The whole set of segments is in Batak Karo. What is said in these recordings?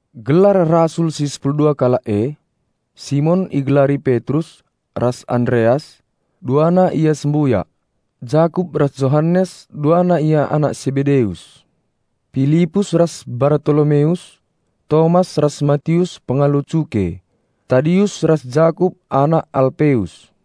Gelar rasul si sepulu dua kalak e: Simon (igelari Petrus) ras Andereas, duana ia sembuyak; Jakup ras Johanes, duana ia anak Sebedeus; Pilipus ras Bartolomeus; Tomas ras Matius pengalo cuke; Tadius ras Jakup anak Alpeus;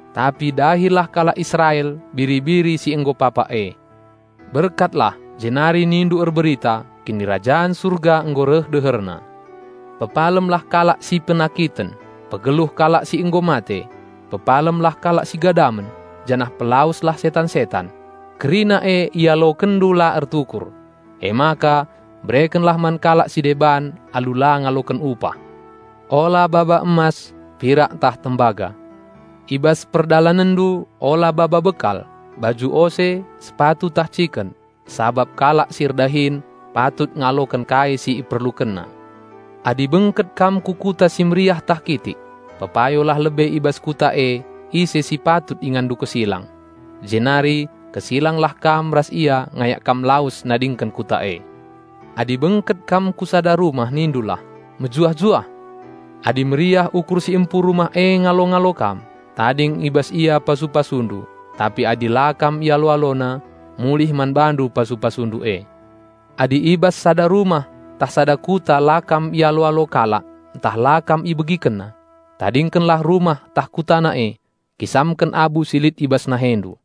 Tapi dahilah kalak Israel biri-biri si nggo papak e. Berkatlah jenari nindu erberita, 'Kinirajan Surga nggo reh deherna.' Pepalemlah kalak si penakiten, pegeluh kalak si nggo mate; pepalemlah kalak si gadamen, janah pelaweslah setan-setan. Kerina e ialokenndu la ertukur. Emaka berekenlah man kalak si deban alu la ngaloken upah. Ola baba emas, pirak ntah tembaga. I bas perdalanenndu ola baba bekal, baju ose, sepatu ntah ciken, sabap kalak si erdahin patut ngaloken kai si iperlukenna. Adi bengket kam ku kuta si meriah ntah kitik, pepayolah lebe i bas kuta e ise si patut inganndu kesilang. Jenari kesilanglah kam ras ia ngayak kam lawes nadingken kuta e. Adi bengket kam ku sada rumah nindulah, 'Mejuah-juah!' Adi meriah ukur si empu rumah e ngalo-ngalo kam, tading i bas ia pasu-pasundu, tapi adi la kam ialo-alona, mulih man bandu pasu-pasundu e. Adi i bas sada rumah ntah sada kuta la kam ialo-alo kalak ntah la kam ibegikenna, tadingkenlah rumah ntah kutana e, kisamken abu si lit i bas nahendu.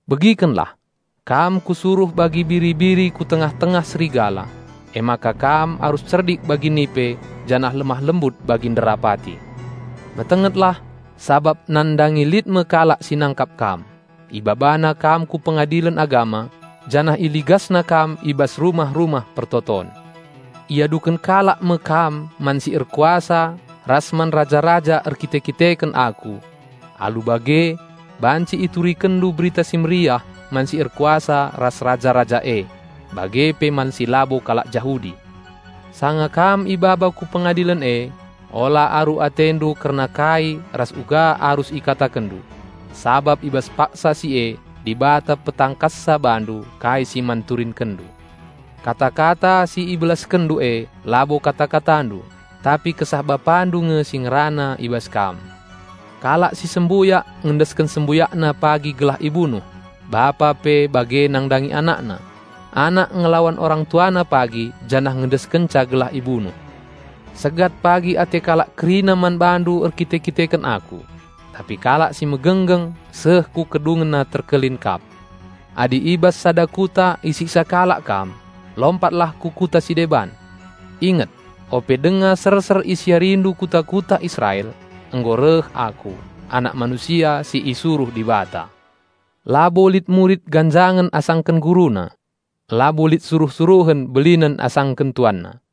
"Begikenlah! Kam Kusuruh bagi biri-biri ku tengah-tengah serigala. Emaka kam arus cerdik bagi nipe janah lemah-lembut bagi nderapati. Metengetlah, sabap nandangi lit me kalak si nangkap kam; ibabanandu ku pengadilen agama janah iligasnandu i bas rumah-rumah persembahen. Iaduken kalak me kam man si erkuasa ras man raja-raja erkite-kiteken Aku. Alu bage banci iturikenndu Berita Si Mehuli man si erkuasa ras raja-raja e bage pe man si labo kalak Jahudi. Sanga kam ibaba ku pengadilen e, ola aru atendu kerna kai ras uga arus ikatakenndu, sabap i bas paksa si e ibereken me man bandu kai si man turinkenndu. Kata-kata si ibelaskenndu e labo kata-katandu, tapi Kesah Bapandu nge si ngerana i bas kam. Kalak si sembuyak ngendesken sembuyakna pagi gelah ibunuh, bapa pe bage nandangi anakna. Anak ngelawan orang tuana pagi janah ngendeskenca gelah ibunuh. Segat pagi ate kalak kerina man bandu erkite-kiteken Aku. Tapi kalak si megenggeng seh ku kedungenna terkelin kap. Adi i bas sada kuta isiksa kalak kam, lompatlah ku kuta si deban. Inget! Ope denga serser isiarindu kuta-kuta Israel, nggo reh Aku, Anak Manusia si isuruh Dibata. Labo lit murid ganjangen asangken guruna; labo lit suruh-suruhen belinen asangken tuanna.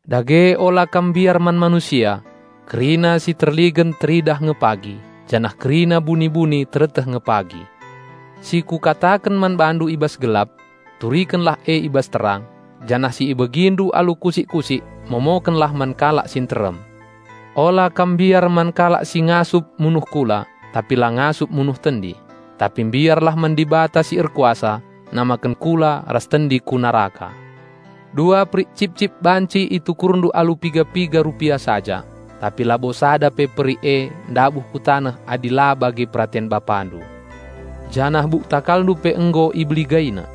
"Dage ola kam mbiar man manusia. Kerina si terligen teridah nge pagi, janah kerina buni-buni tereteh nge pagi. Si Kukataken man bandu i bas gelap, turikenlah e i bas terang, janah si ibegindu alu kusik-kusik momokenlah man kalak si nterem. Ola kam mbiar man kalak si ngasup munuh kula tapi la ngasup munuh tendi; tapi mbiarlah man Dibata si erkuasa namaken kula ras tendi ku neraka. Dua perik cip-cip banci itukurndu alu piga-piga rupia saja; tapi labo sada pe perik e ndabuh ku taneh adi la bage peraten Bapandu. Janah buk takalndu pe nggo IbeligaiNa.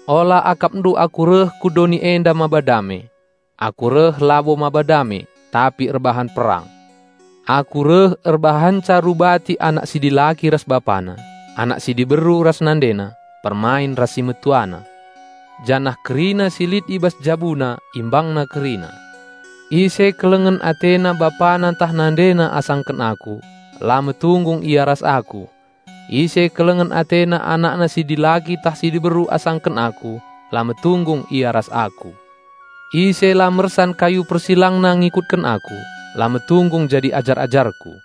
"Ola akapndu Aku reh ku doni enda maba dame. Aku reh labo maba dame, tapi erbahan perang. Aku reh erbahanca rubati anak si dilaki ras bapana, anak si diberu ras nandena, permain ras si metuana, janah kerina si lit i bas jabuna imbangna kerina. Ise kelengen atena bapana ntah nandena asangken Aku, la metunggung ia ras Aku; ise kelengen atena anakna si dilaki ntah si diberu asangken Aku, la metunggung ia ras Aku. Ise la mersan kayu persilangna ngikutken Aku, la metunggung jadi ajar-ajarKu.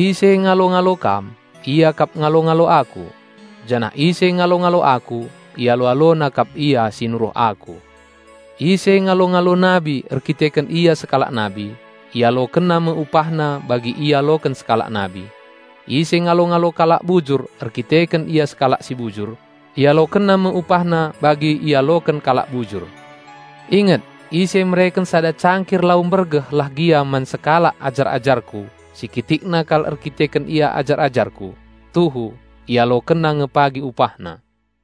"Ise ngalo-ngalo kam, ia kap ngalo-ngalo Aku; janah ise ngalo-ngalo Aku, ialo-alona kap Ia si nuruh Aku. Ise ngalo-ngalo nabi erkiteken ia sekalak nabi, ialokenna me upahna bagi ialoken sekalak nabi. Ise ngalo-ngalo kalak bujur erkiteken ia sekalak si bujur, ialokenna me upahna bagi ialoken kalak bujur. Inget! Ise mereken sada cangkir lau mbergeh lah gia man sekalak ajar-ajarKu si kitikna kal erkiteken ia ajar-ajarKu, tuhu ialokenna nge pagi upahna."